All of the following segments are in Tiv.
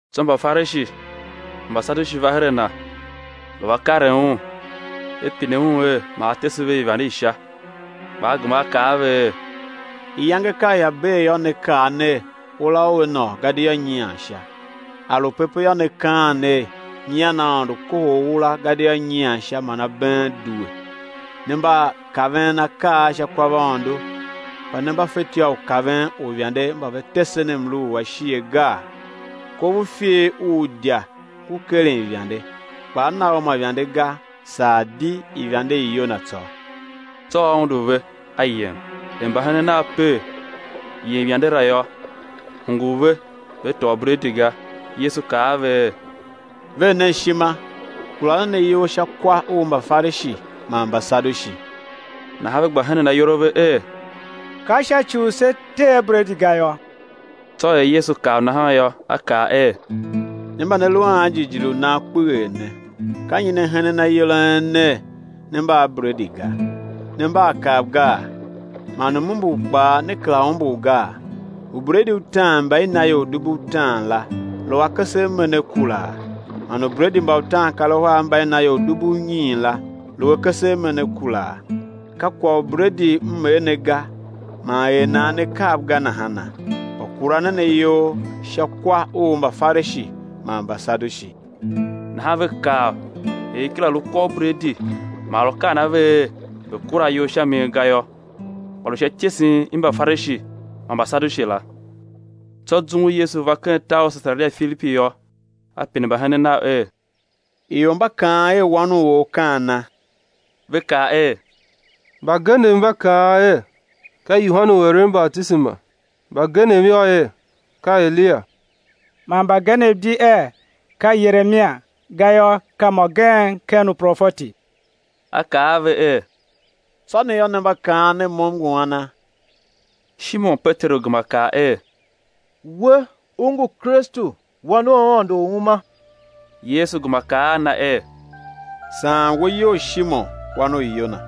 Tsô Mbafarishi man Mbasadushi va her a Na, lu va karen Un, ve pine Un er ma A tese ve ivande i Sha. Kpa A gema A kaa a ve er: [Iyange ka ia bee yô, ne kaa ner: Ura ua nôô, gadia nyian sha. A lu pepe yô, ne kaan ner: Nyian Aôndo kohol ura gadia nyian sha man abeen due. Ne mba kaven akaa a sha kwavaôndo, kpa ne mba fetyô u kaven uivande mba ve tesen mlu u ashighe gaa?]. Kov u ifer u idya ngu keren ivande kpa á na u ma ivande ga, saa di ivande i Yona tsô. Tsô A undu ve A yem. Er mbahenen Nav per yem yande la yô, hungul ve ve tôô bredi ga. Yesu kaa a ve er: Ver nen ishima, kura nen ayol sha kwa u Mbafarishi man Mbasadushi. Nahan ve gba henen ayol a ve er: Ka sha ci u se tee bredi ga yôô? Tsô er Yesu kav nahan yô, A kaa er: Ne mba ne lu a anjighjigh u nan kpeghee ne, ka nyi ne henen ayol a en ner, ne mba a bredi ga? Ne mba a kav gaa? Man m-umbur kpaa ne kera umbur gaa? Ubredi utaan mba i na ior dubu utaan la, lu akese a me ne kuraa? Man ubredi mba utaankaruhar mba i na ior dubu unyiin la, lu akese a me ne kuraa? Ka kwagh u bredi M er ne ga, man er nan ne kav ga nahana? Kpa kura nen ayol sha kwa u Mbafarishi man Mbasadushi. Nahan ve kav er i kera lu kwa u bredi man A lu kaan a ve er ve kura ayol sha min ga yô, kpa lu sha ityesen i Mbafarishi man Mbasadushi la. Tsô zum u Yesu va ken tar u Sesaria Filipi yô, A pine mbahenen Nav er: Ior mba kaan er, Wan u or, ka ana? Ve kaa er: Mbagenev mba kaan er: Ka Yohane u eren batisema, mbagenev yô, er: Ka Eliya; man mbagenev di er: Ka Yeremia; gayô, ka mô gen ken uprofeti. A kaa a ve er: Tsô ne yô, ne mba kaan ner, Mo M ngu ana? Shimon Peteru gema kaa er: We U ngu Kristu Wan u Aôndo u uma. Yesu gema kaa a na er: Saan we iyol Shimon, wan u Yona,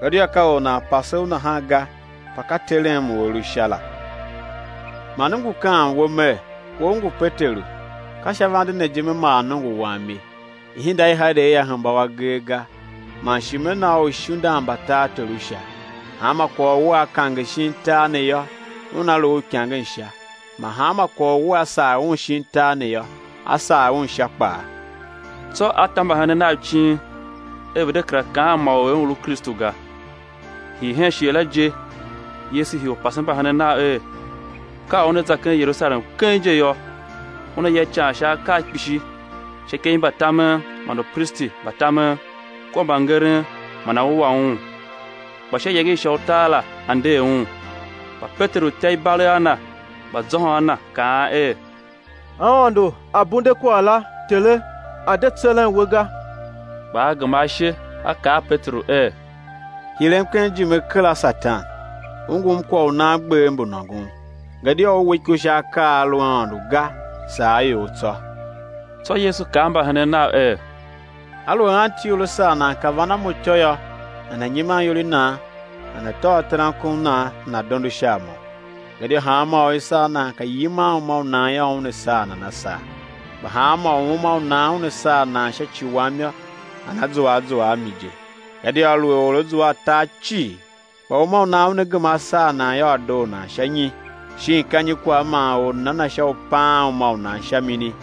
gadia ka or nan pase u nahan ga, kpa ka Terem u A lu Sha la. Man M ngu kaan we Mer: We u ngu Peteru; ka sha vande ne je Me maa nongo Wam ye, ihinda i Hade ia hemba u agee ga. Man shi Me na u uishindan mba tartor u Sha; hanma kwagh u wea kange shin tar ne yô, una lu uikangen Sha, man hanma kwagh u wea sagh un shin tar ne yô, á sagh un Sha kpaa. Tsô A ta mbahenen Nav icin er ve̱ de kera kaan man or er Un lu Kristu ga. Hii hen shighe la je, Yesu hii u pasen mbahenen Nav er, ka u Una za hen Yerusalem keng je yô, Una ya ican sha akaa kpishi sha ikev i mbatamen man upristi mba tamen kua mbangeren man á wua Un, kpa sha iyange i sha utar la á nder Un. Kpa Peteru ta ibalegh a Na, gba zôhôn a Na, kaan er: Aôndo A̱ bunde kwagh la, Tere, a̱ de tseren We ga. Kpa A gema ashe a kaa a Peteru er: Hirem ken ijime kera, Satan, u ngum kwagh u nan gbev mbu nôngon, gadia u we iko sha akaa a a lu a Aôndo ga, saa a ior tsô. Tsô Yesu kaa a mbahenen Nav er: Aluer anti or a sar nan pe van a mo ityô yô, nana̱ nyiman iyol i nan, nana̱ tôô terankon u nan, nana̱ dondo sha a Mo. Gadia hanma or u i sar nan pe yiman uma u nan yô, una saa nan a saa, kpa hanmô u uma u nan una saa nan sha ci Wam yô, nana zua a zua a mi je. Gadia aluer or á zua a tar cii, kpa uma u nan una gema á saa nan yô, á doo nan sha nyi? Shin ka nyi kwagh man or nana na sha u paan uma u nan sha mini?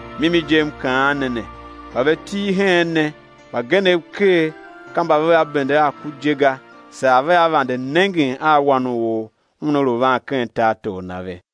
Mimi je M kaan ne ne, mba ve til heen ne, mbagenev ker ka mba vea bende a ku je ga, saa vea vande nengen a Wan u or Una lu van ken tartor Na ve.